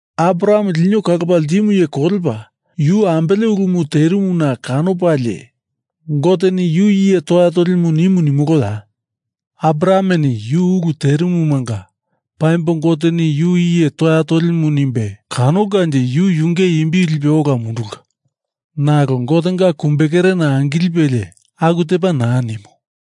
Abraham lino kalopa ltimu iye kolepa, yu ambele ulumu terimuna kanopalie Goteni yu iye toya tolimu nimu nimoloya? Abrahameni yu ulu terimumanga paimbo Goteni yu iye toya tolimu nimbe kanolkanje yu yunge imbi lipe ola mundulka. Nalo Gotenga kumbekerena angilipelie aku tepa naa nimu.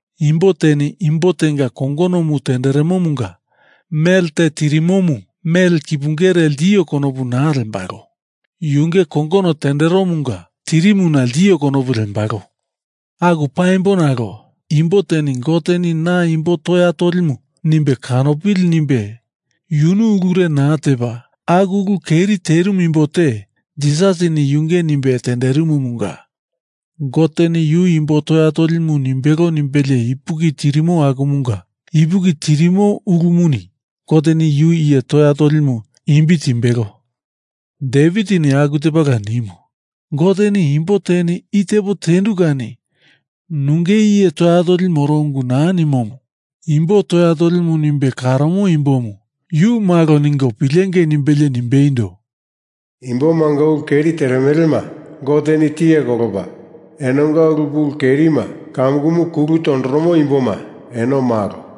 Imbo teni imbo tenga kongonomu tenderemomunga mele te tirimomu mele kipungere ltio konopu naa lembalo. Yunge kongono tenderomunga tirimuna ltio konopu lembalo. Aku paimbo nalo imbo teni Goteni na imbo toya tolimu nimbe kanopili nimbe yunu ulure naa tepa aku ulu keri terimu imbo te Jisasini yunge nimbe tenderimumunga Goteni yu imbo toya tolimu nimbelo nimbelie ipuki tirimo akumunga ipuki tirimo ulumuni Goteni yu iye toya tolimu imbi timbelo. Devitini aku tepala nimu. Goteni imbo teni i tepo tendu kani nunge iye toya toli moro ungu naa nimomu imbo toya tolimu nimbe karomo imbomu yu malo ningo pilengei nimbelie nimbeindo, Imbomanga ulu keri teremelema Goteni tiye kolopa, enonga ulu pulu kerima kamukumu kulu tondoromo imboma, eno malo.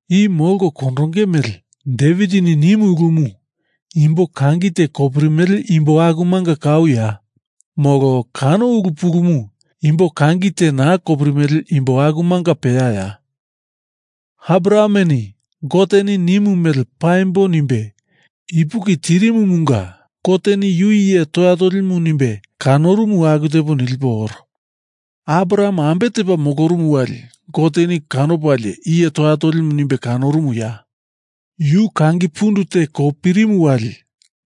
I molko kondonge mele Devitini nimu ulumu imbo kangi te kopirimele imbo akumanga kauya? Molo kano ulu pulumu imbo kangi te naa kopirimele imbo akumanga peyaya? Abrahameni Goteni nimu mele paimbo nimbe ipuki tirimumunga Goteni yu iye toya tolimu nimbe kanorumu aku tepo nilipo oro. Abraham ambe tepa molorumu wali Goteni kanopalie iye toya tolimu nimbe kanorumuya? Yu kangi pundu te kopirimu wali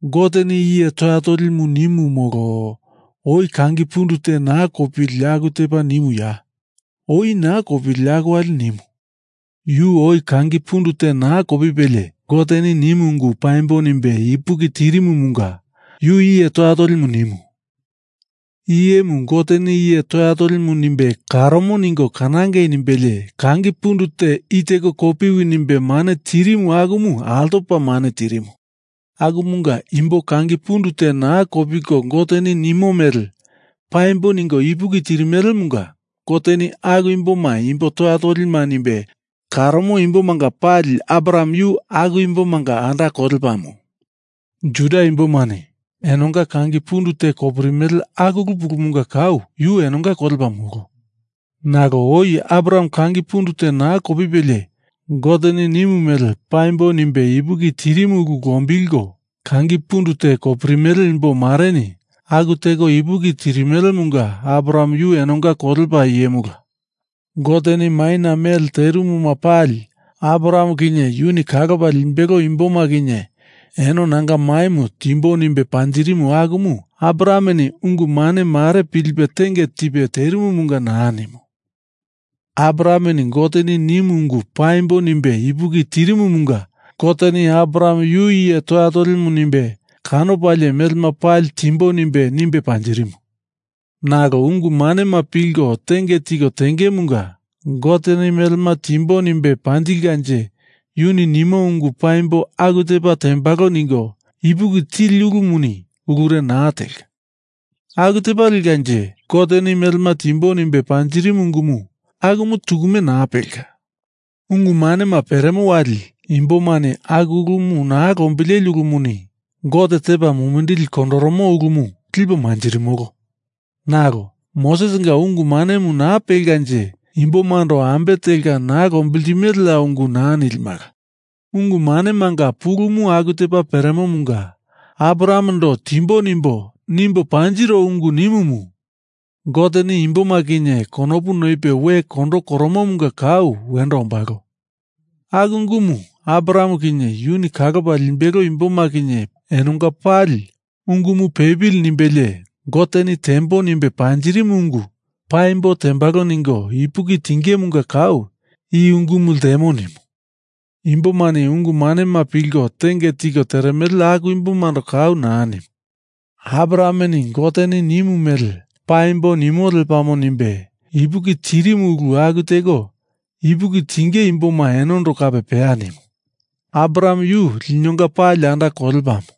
Goteni iye toya tolimu nimu molo oi kangi pundu te naa kopili aku tepa nimuya? Oi naa kopili aku wali nimu. Yu oi kangi pundu te naa kopipelie Goteni nimu ungu paimbo nimbe ipuki tirimumunga Goteni yu iye toya tolimu nimu. I iyemu Goteni iye toya tolimu nimbe karomo ningo kanangei nimbelie kangi pundu te i teko kopiwi nimbe mane tirimu akumu altopa mane tirimu. Akumunga imbo kangi pundu te naa kopiko Goteni nimo mele paimbo ningo ipuki tirimelemunga Goteni aku imboma imbo toya tolima nimbe karomo imbomanga pali Abraham yu aku imbomanga anda kolepamu. Juda imbomani enonga kangi pundu te kopirimele aku ulu pulumunga kau yu enonga kolepa, molo. Nalo oi Abraham kangi pundu te naa kopipelie Goteni nimu mele paimbo nimbe ipuki tirimu ulu lombilko kangi pundu te kopiririmele imbo mareni aku teko ipuki tirimelemunga Abraham yu enonga kolepa iyemula. Goteni maina mele terimuma pali Abraham kinye yuni kalopa limbelo imboma kinye eno nanga maimu timbo nimbe panjirimu akumu Abrahameni ungu mane mare pilipe tenge tipe terimumunga naa nimu. Abrahameni Goteni nimu ungu paimbo nimbe ipuki tirimumunga Goteni Abraham yu iye toya tolimu nimbe kanopalie melema pali timbo nimbe, nimbe panjirimu. Nalo ungu manema pilko tenge tiko tengemunga Goteni melema timbo nimbe panjilkanje yuni nimo ungu paimbo aku tepa tembalo ningo ipuki tili ulumuni ulure naa telka. Aku tepa lekanje Goteni melema timbo nimbe panjirimu ungumu akumu tukume naa pelka. Ungu manema peremo wali imbomani aku ulumu naa lombileli ulumuni Gote tepa mumindili kondoromo ulumu lipo manjirimolo. Nalo Mosesinga ungu manemu naa pelkanje imbomando ambe telka naa lombiltimeleya ungu naa nilimala. Ungu manemanga pulumu aku tepa peremomunga Abrahamendo timbo nimbo, nimbo panjiro ungu nimumu Goteni imboma kinye konopu noipe we kondo koromomunga kau wendo ombalo. Aku ungumu Abraham kinye yuni kalopa limbelo imboma kinye enonga pali ungumu pepili nimbelie Goteni tembo nimbe panjirimu ungu paimbo tembalo ningo ipuki tingemunga kau i ungumu ltemo nimu. Imbomani ungu manema pilko tenge tiko teremele aku imbomando kau naa nimu. Abrahameni Goteni nimu mele paimbo nimo lepamo nimbe ipuki tirimu ulu aku teko ipuki tinge imboma enondo kape peya nimu. Abraham yu linonga pali anda kolepamu.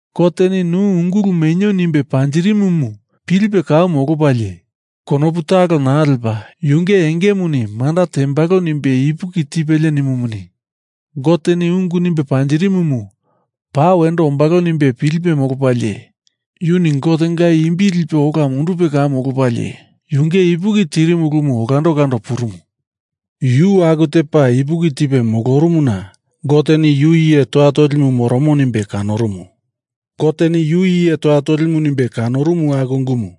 Goteni nu ungulu menio nimbe panjirimumu pilipe kau molopalie konopu talo naa lepa yunge engemuni manda tembalo nimbe ipuki tipelie nimumuni, Goteni ungu nimbe panjirimumu paa wendo ombalo nimbe pilipe molopalie yuni Gotenga imbi lipe ola mundupe kau molopalie yunge ipuki tirimu ulumu olando olando purumu. Yu aku tepa ipuki tipe molorumuna Goteni yu iye toya tolimu moromo nimbe kanorumu. Goteni yu iye toya tolimu nimbe kanorumu aku ungumu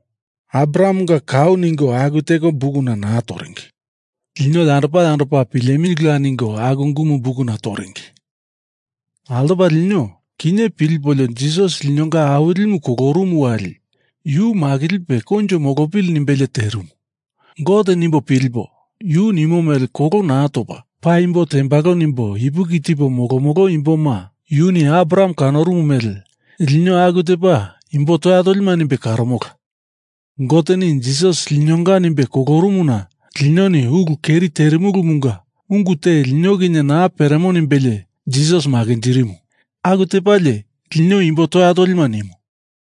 Abrahamenga kau ningo aku teko bukuna naa toringi. Lino yandopa yandopa pilemilila ningo aku ungumu bukuna tondoringi. Altopa lino kinye pilipolio Jisas linonga Awilimu kolorumu wali Yu makilipe koinjo molopili nimbelie terimu Gote nimbo pilipo yu nimo mele kolo naa topa paimbo tembalo nimbo ipuki tipo molomolo imboma yuni Abraham kanorumu mele lino aku tepa imbo toya tolima nimbe karomola. Goteni Jisas linonga nimbe kolorumuna linoni ulu keri terimulumunga ungu te lino kinye naa peremo nimbelie Jisas makinjirimu. Aku tepalie lino imbo toya tolima nimu.